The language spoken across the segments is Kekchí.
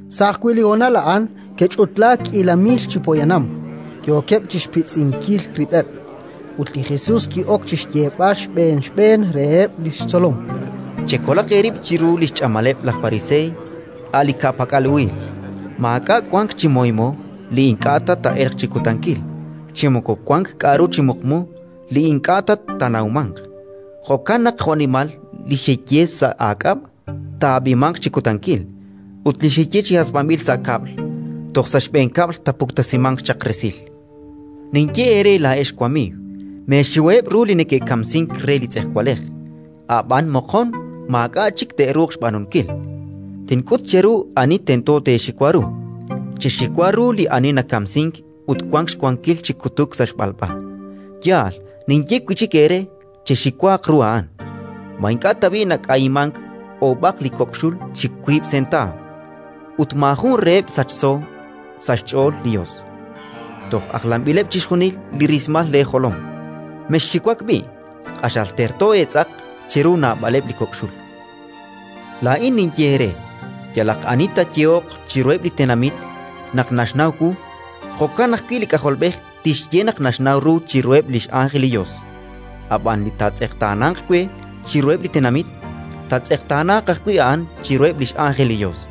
Sa' ajwi' li honal a'an ke'ch'utlaak k'iila mil chi poyanam, yookeb' chi xpitz'inkil rib'eb'. Ut li Jesus ki'ok chi xyeeb'al xb'een xb'een reheb' li xtzolom: “Chekolaq eerib' chiru li xch'amaleb' laj Pariseey, a' li ka'pak'al uhil. Maak'a' wank chi moymo li ink'a' ta taa'elq chi kutankil, chi moko wank k'aru chi muqmu li ink'a' ta taanawmanq. Jo'kan naq jo'nimal li xeye sa' aak'ab', taa'ab'imanq chi kutankil. Ut li xeye chi hasb'anb'il sa' kab'l, toj sa' xb'een kab'l taapuktesimanq chaq resil. “Ninye eere laa'ex wamiiw: Meexiwaheb' ru li neke'kamsink re li tz'ejwalej, ab'an moqon maak'a' chik te'ruuq xb'aanunkil. Tink'ut cheru ani tento teexiwa ru: chexiwa ru li ani nakamsink ut wank xwankil chi kutuk sa' xb'alb'a. Yaal, ninye wi' chik eere: chexiwaaq ru a'an. “Ma ink'a' tab'i' nak'ayimank oob'aq li kok' xul chi wiib' sentaaw? Ut maajun reheb' sachso sa' xch'ool li Yos. Toj ajlanb'ileb' chixjunil li rismal leejolom! Mexxiwak b'i': q'axal terto eetz'aq chiru naab'aleb' li kok' xul. “Laa'in ninye eere: Yalaq ani taayehoq chiruheb' li tenamit naq naxnaw wu, jo'kan ajwi' li K'ajolb'ej tixye naq naxnaw ru chiruheb' li x'ánjel li Yos. Ab'an li taatz'eqtaananq we chiruheb' li tenamit, taatz'eqtaanaaq ajwi' a'an chiruheb' li x'ánjel li Yos.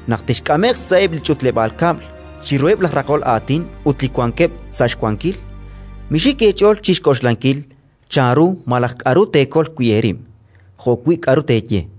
“Naq texk'ame'q sa'eb' li ch'utleb'aal kab'l, chiruheb' laj raqol aatin ut li wankeb' sa' xwankil, mixik eech'ool chi xk'oxlankil chanru malaj k'aru teekol wi' eerib', jo'wi' k'aru teeye,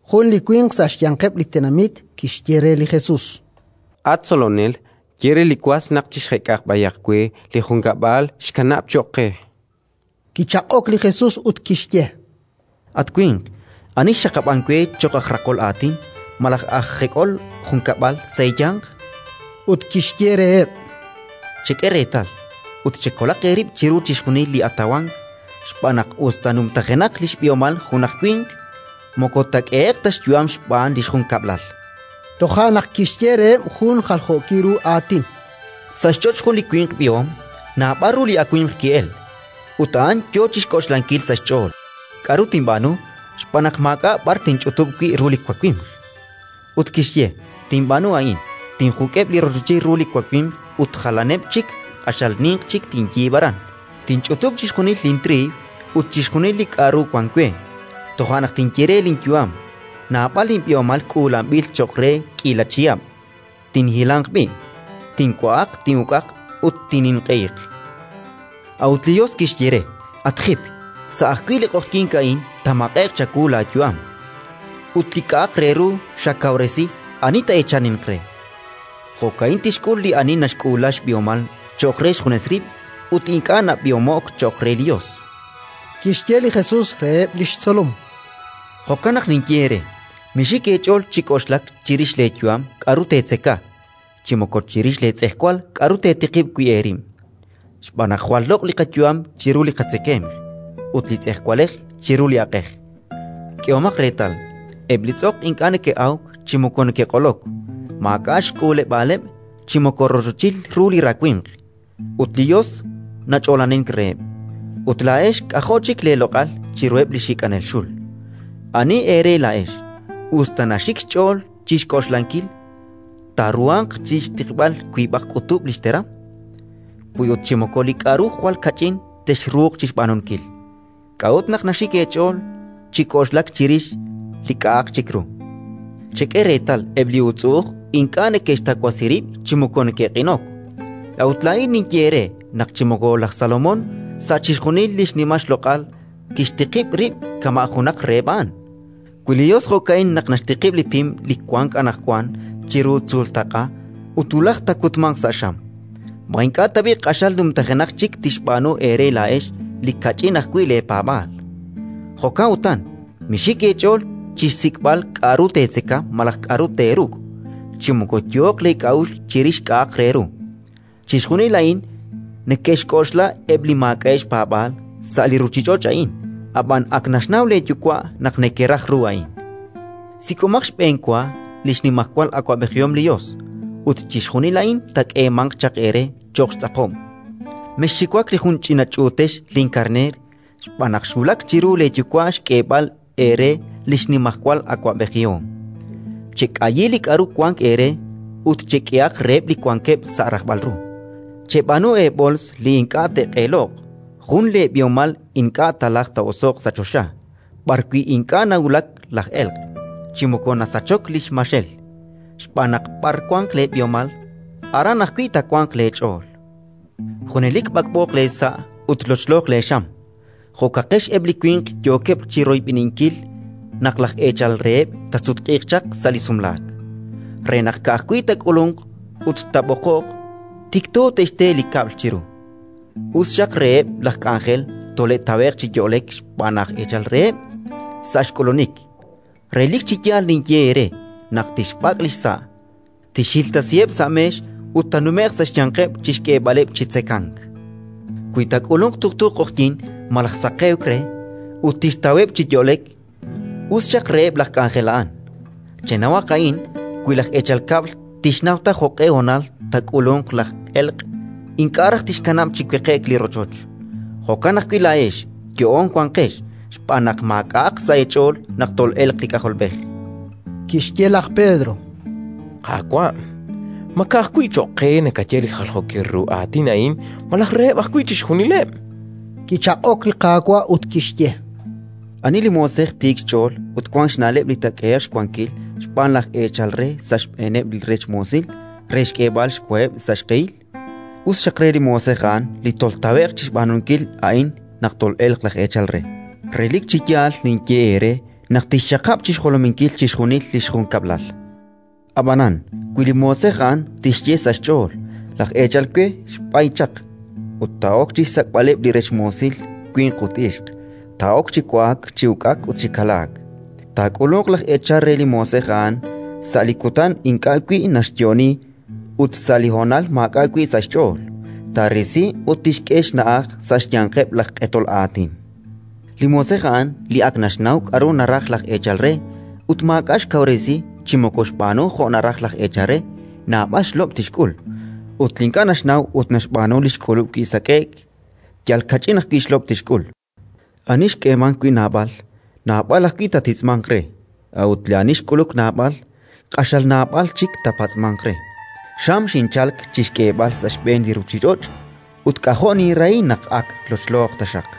Jun li winq sa' xyanqeb' li tenamit kixye re li Jesus: —At Tzolonel, ye re li was naq chixjek'aq b'ayaq we li junkab'lal xkanaak cho'q qe. Kichaq'ok li Jesus ut kixye: —At winq, ani xxaqab'ank we cho'q aj raqol aatin malaj aj jek'onel junkab'lal sa' eeyanq? Ut kixye reheb': —Chek'e reetal ut chekolaq eerib' chiru chixjunil li atawank, xb'aan naq, us ta numtajenaq li xb'ihomal junaq winq, moko taak'ehe'q ta xyu'am xb'aan li xjunkab'lal. Toja' naq kixye reheb' jun li jaljookil ru aatin: “Sa' xch'och' jun li winq b'ihom naab'al ru li awimq ki'elk. Ut a'an yo chi xk'oxlankil sa' xch'ool: «K'aru tinb'aanu? Xb'aan naq maak'a' b'ar tinch'utub' wi' ru li wawimq». Ut kixye: «Tinb'aanu a'in: tinjuk'eb' li rochochil ru li wawimq ut jalaneb' chik q'axal ninq chik tinyiib'; aran tinch'utub' chixjunil lintriiw ut chixjunil li k'aru wank we. Toja' naq tinye re li linyu'am: Naab'al linb'ihomal k'uulanb'il cho'q re k'iila chihab'. Tinhilanq b'i', tinwa'aq, tin'uk'aq ut tinninq'ehiq». A'ut li Yos kixye re: «At jip, sa' ajwi' li q'oqyink a'in taamaq'e'q chawu laayu'am. Ut li k'a'aq re ru xakawresi, ani taa'eechaninq re?». “Jo'ka'in tixk'ul li ani naxk'uula xb'ihomal cho'q re xjunes rib' ut ink'a' nab'ihomo'k cho'q re li Yos”. Kixye li Jesus reheb' li xtzolom: “Jo'kan naq ninye eere: Mixik eech'ool chi k'oxlak chirix leeyu'am k'aru teetzeka, chi moko chirix leetz'ejwal k'aru teetiqib' wi' eerib', xb'aan naq jwal loq' li qayu'am chiru li qatzekemq, ut li tz'ejwalej chiru li aq'ej. K'ehomaq reetal eb' li tz'oq: ink'a' neke'awk chi moko neke'q'olok; maak'a' xk'uuleb'aaleb' chi moko rochochil ru li rawimq, ut li Yos nach'oolanink reheb'. Ut laa'ex k'ajo' chik leeloq'al chiruheb' li xik'anel xul! “Ani eere laa'ex, us ta naxik xch'ool chi xk'oxlankil, taaruhanq chi xtiqb'al wiib'aq k'utub' li xteram? Wi ut chi moko li k'aru jwal kach'in texruuq chi xb'aanunkil, k'a'ut naq naxik eech'ool chi k'oxlak chirix li k'a'aq chik ru? “Chek'e reetal eb' li uutz'u'uj: ink'a' neke'xtawasi rib' chi moko neke'q'inok. A'ut laa'in ninye eere naq chi moko laj Salomón sa' chixjunil li xnimal xloq'al kixtiqib' rib' kama' junaq reheb' a'an. Wi li Yos jo'ka'in naq naxtiqib' li pim li wank anaqwan chiru tzuultaq'a ut wulaj taakutmanq sa' xam, ma ink'a' tab'i' q'axal numtajenaq chik tixb'aanu eere laa'ex li kach'in ajwi' leepaab'aal? “Jo'kan utan mixik eech'ool chi xsik'b'al k'aru teetzeka malaj k'aru teeruk', chi moko yooq leek'a'uxl chirix k'a'aq re ru. Chixjunil a'in neke'xk'oxla eb' li maak'a'eb' xpaab'aal sa' li ruuchich'och' a'in. Ab'an ak naxnaw leeYuwa' naq nekeraj ru a'in. Sik'omaq xb'enwa li xnimajwal awab'ejihom li Yos, ut chixjunil a'in taak'eemanq chaq eere cho'q xtz'aqob'. “Mexxiwak li jun ch'ina ch'uutex linkarneer, xb'aan naq xwulak chiru leeYuwa' xk'eeb'al eere li xnimajwal awab'ejihom. “Chek'ayi li k'aru wank eere ut chek'ehaq reheb' li wankeb' sa' rajb'al ru. Cheb'aanu eeb'ools li ink'a' te'q'eeloq, jun leeb'ihomal li ink'a' taalajq taa'oso'q sa' choxa, b'arwi' ink'a' nawulak laj elq', chi moko nasachok li xmaxel. Xb'aan naq b'ar wanq leeb'ihomal, aran ajwi' taawanq leech'ool. “Junelik b'ak'b'ooq leesa' ut lochlooq leexam. Jo'kaqex eb' li winq yookeb' chi royb'eninkil naq laj eechal reheb' taasutq'iiq chaq sa' li sumlaak, re naq, ka'ajwi' taak'ulunq ut taab'oqoq, tikto te'xte li kab'l chiru. Us xaq reheb' laj k'anjel tole'tawe'q chi yo'lek xb'aan laj eechal reheb' sa' xk'ulunik. Relik chi yaal ninye eere naq tixb'ak' li xsa', tixhiltasiheb' sa' meex ut taanume'q sa' xyanqeb' chi xk'eeb'aleb' chi tzekank. Wi taak'ulunq tuqtu q'oqyink malaj saqewk re ut tixtaweb' chi yo'lek, us xaq reheb' laj k'anjel a'an! “Chenawaq a'in: wi laj eechal kab'l tixnaw ta jo'q'e honal taak'ulunq laj elq', ink'a' raj tixkanab' chi weqe'k li rochoch. Jo'kan ajwi' laa'ex yo'oon wanqex, xb'aan naq maak'a'aq sa' eech'ool naq tol'elq li K'ajolb'ej”. Kixye laj Pedro: —Qaawa', ma ka'ajwi' cho'q qe nakaye li jaljookil ru aatin a'in malaj reheb' ajwi' chixjunileb'? Kichaq'ok li Qaawa' ut kixye: “Ani li moosej tiik xch'ool ut wank xna'leb' li taak'ehe'q xwankil xb'aan laj eechal re sa' xb'eeneb' li rech moosil re xk'eeb'al xwaheb' sa' xq'ehil? Us xaq re li moosej a'an li toltawe'q chi xb'aanunkil a'in naq tol'elq laj eechal re. Relik chi yaal ninye eere naq tixxaqab' chi xjolominkil chixjunil li xjunkab'lal. Ab'anan, wi li moosej a'an tixye sa' xch'ool: «Laj eechal we xb'ay chaq», ut taa'ok chi xsak'b'aleb' li rech moosil winq ut ixq, taa'ok chi wa'ak, chi uk'ak ut chi kalaak, taak'ulunq laj eechal re li moosej a'an sa' li kutan ink'a' wi' naxyo'oni ut sa' li honal maak'a' wi' sa' xch'ool, taarisi ut tixk'e xna'aj sa' xyanqeb' laj q'etol aatin. “Li moosej a'an li ak naxnaw k'aru naraj laj eechal re ut maak'a' xkawresi chi moko xb'aanu jo' naraj laj eechal re, naab'al xlob' tixk'ul. Ut li ink'a' naxnaw ut xb'aanu li xk'ulub' wi sak'e'k, yal kach'in ajwi' xlob' tixk'ul. Ani xk'eemank wi' naab'al, naab'al ajwi' taatitz'manq re; a'ut ani xk'uluk naab'al, q'axal naab'al chik taapatz'manq re. “Xam xinchalk chi xk'eeb'al sa' xb'een li ruuchich'och' ut k'ajo' ninrahi naq ak lochlooq taxaq!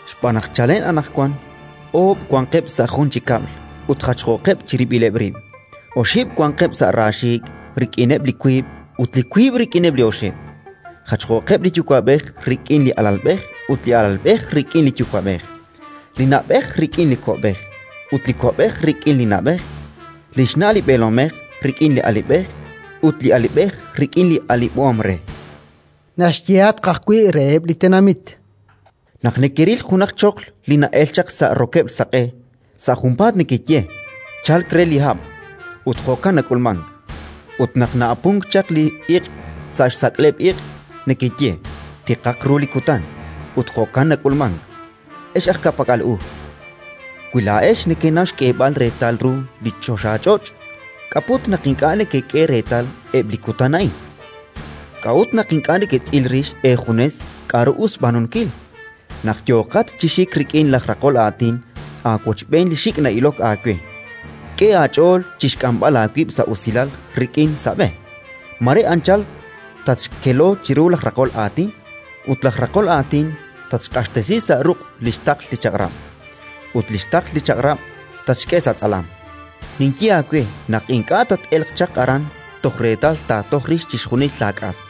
Xb'aan naq chalen anaqwan oob' wanqeb' sa' jun chi kab'l ut jachjooqeb' chirib'ileb' rib': oxib' wanqeb' sa' raaxiik' rik'ineb' li wiib' ut li wiib' rik'ineb' li oxib'; jachjooqeb' li yuwa'b'ej rik'in li alalb'ej ut li alalb'ej rik'in li yuwa'b'ej; li na'b'ej rik'in li ko'b'ej ut li ko'b'ej rik'in li na'b'ej; li xna' li b'eelomej rik'in li alib'ej ut li alib'ej rik'in li alib'om re”. Naxyehatq ajwi' reheb' li tenamit: “Naq nekeril junaq choql li na'elk chaq sa' rokeb'l saq'e, sa' junpaat nekeye: «Chalk re li hab'»; ut jo'kan nak'ulmank. Ut naq na'apunk chaq li iq' sa' xsak'leb' iq', nekeye: «Tiqaq ru li kutan»; ut jo'kan nak'ulmank. Ex aj ka'pak'al u! Wi laa'ex nekenaw xk'eeb'al reetal ru li choxach'och', k'a' put naq ink'a' nekek'e reetal eb' li kutan a'in? “K'a'ut naq ink'a' neketz'il rix eejunes k'aru us xb'aanunkil? Naq yooqat chi xik rik'in laj raqol aatin aawochb'een li xik' na'ilok aawe, k'e aach'ool chi xk'amb'al aawib' sa' usilal rik'in, sa' b'e. Mare anchal tatxkelo chiru laj raqol aatin, ut laj raqol aatin tatxq'axtesi sa' ruq' li xtaql li chaq'rab', ut li xtaql li chaq'rab' tatxk'e sa' tz'alam. Ninye aawe naq ink'a' tat-elq chaq aran toj reetal taatoj rix chixjunil laak'as”.